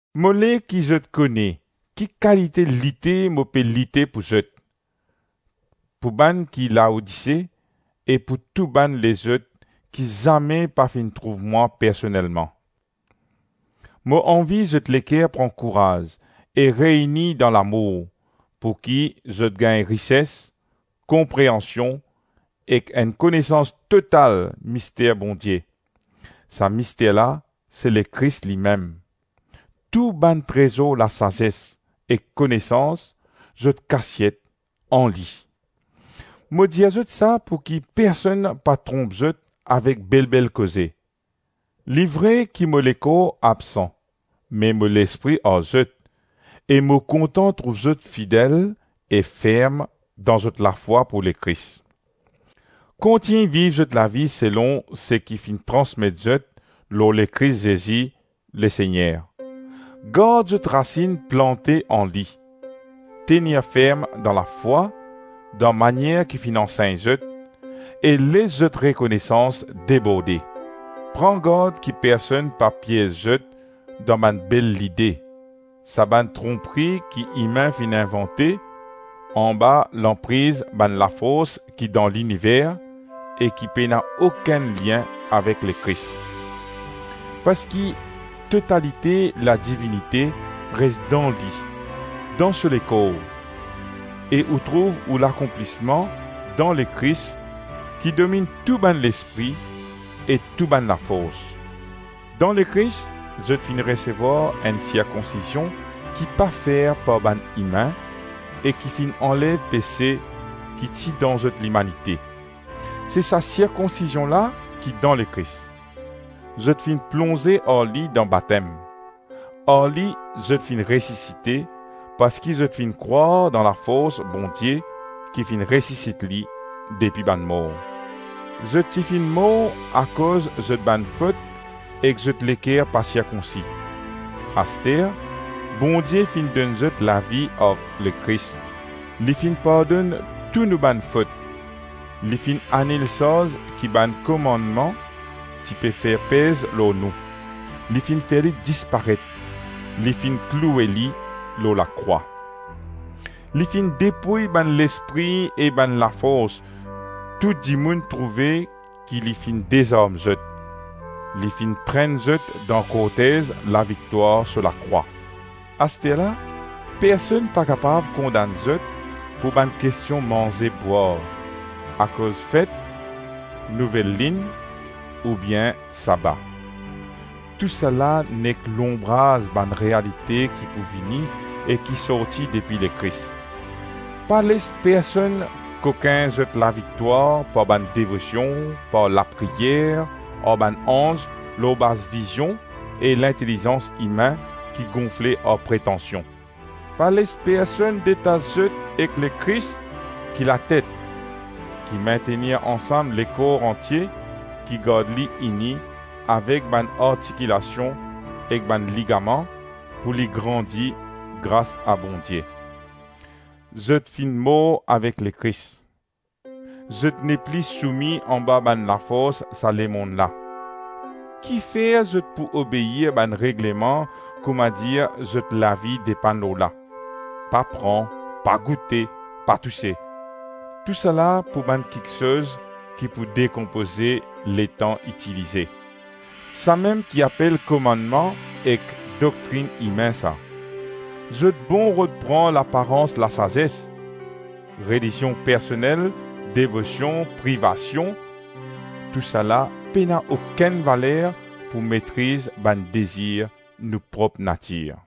Mo le ki zot kone ki kalite lite mo pe lite pou zot, pou bann ki Laodise, e pou tou bann lezot ki zame pa finn trouv mwa personelman. Mo anvi zot leker pran kouraz e reyni dan lamour, pouki zot gagn rises, konpreansion ek enn konesans total mister Bondie: sa mister la se Lekris limem; tou bann trezor lasazes ek konesans, zot kasiet an li. Mo dir zot sa pouki personn pa tronp zot avek bel-bel koze. Li vre ki mo lekor absan, me mo lespri ar zot e mo kontan trouv zot fidel e ferm dan zot lafwa pou Lekris. Kontign viv zot lavi selon seki finn transmet zot lor Lekris Zezi Lesegner, gard zot rasinn plante an li, tenir ferm dan lafwa, dan manier ki finn ansegn zot, e les zot rekonesans deborde. Pran gard ki personn pa piez zot dan bann bel lide, sa bann tronpri ki imin finn invante, anba lanpriz bann lafors ki dan liniver, e ki pena okenn lien avek Lekris. Parski totalite ladivinite res dan li, dan so lekor, e ou trouv ou lakonplisman dan Lekris ki dominn tou bann Lespri e tou bann Lafors. Dan Lekris, zot finn resevwar enn sirkonsizion ki pa fer par bann imin e ki finn anlev pese ki ti dan zot limanite: se sa sirkonsizion la ki dan Lekris. Zot finn plonze ar li dan batem, ar li zot finn resisite parski zot finn krwar dan lafors Bondie ki finn resisit li depi bann mor. Zot ti finn mor akoz zot bann fot ek zot leker pa sirkonsi; aster Bondie finn donn zot lavi ar Lekris; li finn pardonn tou nou bann fot, li finn anil sarz ki bann komannman ti pe fer pez lor nou; li finn fer li disparet, li finn kloue li lor lakrwa. Li finn depouy bann Lespri e bann Lafors, tou dimoun trouve ki li finn dezarm zot, li finn trenn zot dan kortez laviktwar so lakrwa. Asterla, personn pa kapav kondann zot pou bann kestion manze bwar, akoz fet, nouvel linn ou bien saba. Tousala nek lonbraz bann realite ki pou vini e ki sorti depi Lekris. Pa les personn kokin zot laviktwar par bann devosion, par lapriyer ar bann anz lor baz vizion e lintelizans imin ki gonfle ar pretansion. Pa les personn detas zot ek Lekris ki latet, ki mintenir ansam lekor antie, ki gard li ini avek bann artikilasion ek bann ligaman, pou li grandi gras a Bondie. Zot finn mor avek Lekris, zot ne pli soumi anba bann lafors sa lemonn la; kifer zot pou obeir bann regleman kouma dir zot lavi depann lor la: “Pa pran, pa goute, pa touse”? Tousala pou bann kiksoz ki pou dekonpoze letan itilize; samem ki apel komannman ek doktrinn imin sa! Zot bon rod pran laparans lasazes: relizion personel, devosion, privasion; tousala pena okenn valer pou metriz bann dezir nou prop natir.